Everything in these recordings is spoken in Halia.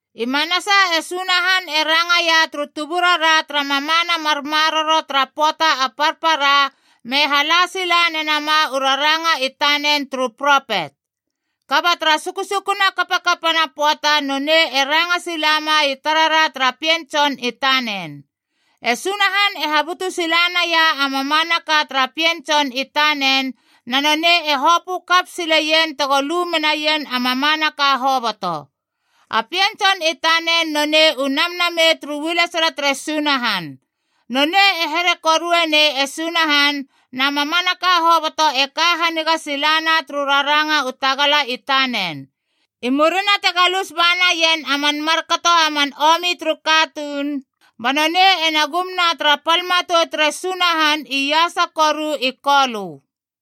I manasa e Sunahan e rangaia turu tuburara tara mamana mar maroro tara pöata a parpara, me hala sila nenama u raranga i tanen turu propet. Kaba tara sukusukuna kapakapana pöata nonei e ranga silama i tarara tara Pien Tson i tanen. E Sunahan e habutu sila naia a mamanaka tara Pien Tson i tanen, na nonei e hopö kap sileien tego lu menaien a mamanaka hoboto. A Pien Tson i tanen nonei u namnamei turu ualesala tere Sunahan. Nonei e here korue nei e Sunahan, na mamanaka hoboto e ka haniga silana turu raranga u tagala i tanen. I murina te galus ba naien a man markato a man omi turu katuun, ba nonei ena gumna tara pal matou tere Sunahan iasa koru i Kolö.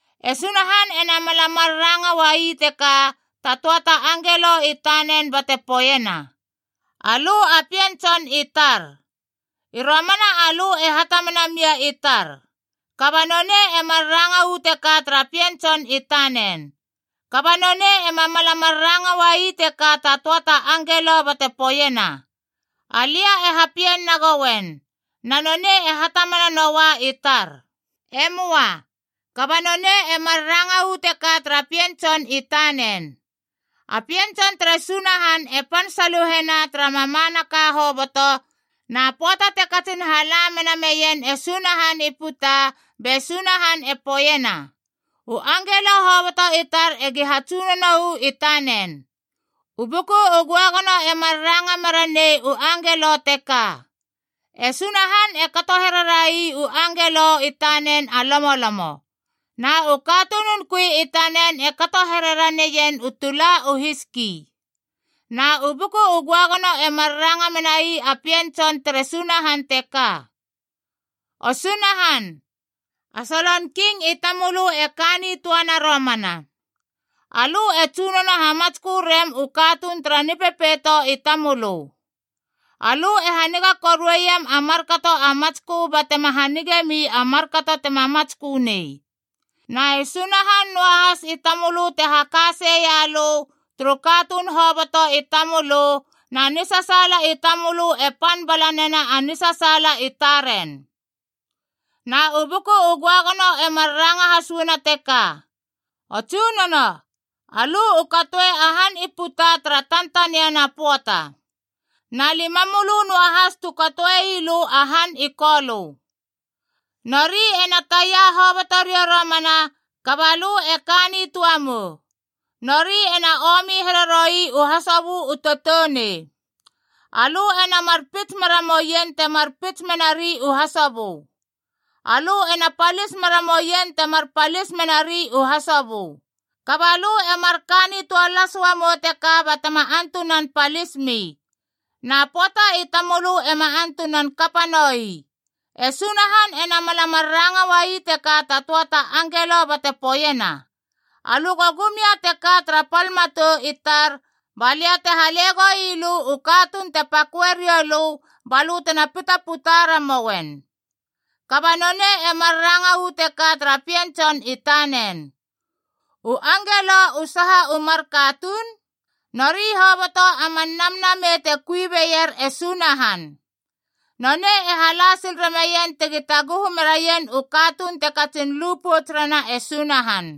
E Sunahan ena mala mar ranga uai teka ta töa ta angelo i tanen bate poeiena: “Alö a pien Tson i tar. I romana alö e hatamana mia i tar.” Kaba nonei e mar ranga uu teka tara Pien Tson i tanen. Kaba nonei ema mala mar ranga uai teka ta töa ta angelo bate poeiena, “Alia e hapien nagouen, na nonei e hatamana noua i tar.” E möa. Kaba nonei e mar ranga uu teka tara Pien Tson i tanen. A Pien Tson tere Sunahan e pan saluhena tara mamanaka hoboto, na pöata te katsin hala mena meien e Sunahan i puta, be Sunahan e poeiena, “U angelo hoboto i tar egi hatsunono uu i tanen.” U Buku u Göagono e mar ranga meranei u angelo teka: “E Sunahan e kato here rai u angelo i tanen a lomolomo. Na u katunun kui i tanen e kato here raneien u tula u hiski.” Na u Buku u Göagono e mar ranga menai a Pien Tson tere Sunahan teka: “O Sunahan, a solon king i tamölö e ka nitöana romana. Alö e tsunono hamatskö rem u katuun tara nipepeito i tamölö. Alö e haniga korueiem a markato a matskö batema hanige mi a markato tema matskö nei. Na e Sunahan noahas i tamölö te haka sei ia lö turu katuun hoboto i tamölö, na nisasaala i tamölö e pan bala nena a nisasaala i taren.” Na u Buku u Göagono e mar ranga has uana teka, “O Tsunono, alö u katoe a han i puta tara tantaniana pöata. Na lima mölö noahas tu katoe ii lö a han i kolö. Nori ena taia hoboto riou romana, kaba lö e ka nitöa mou. Nori ena omi here roi u hasobö u toutounei. Alö ena mar pits mera moien temar pits menari u hasobö. Alö ena palis mera moien temar palis menari u hasobö. Kaba lö e marka nitöa las uamou teka batema antunan palismi. Na pöata i tamölö ema antunan kapa noi.” E Sunahan ena mala mar ranga uai teka ta töa ta angelo bate poeiena, “Alö go gum ia teka tara pal matou i tar balia te hale goilö u katuun te paköe riou lö balö tena pitaputa ramouen.” Kaba nonei e mar ranga uu teka tara Pien Tson i tanen. U angelo u saha u mar katuun? Nori hoboto a man namnamei te kui beier e Sunahan. Nonei e hala sil rameien tegi taguhu meraien u katuun te katsin lu pouts rena e Sunahan.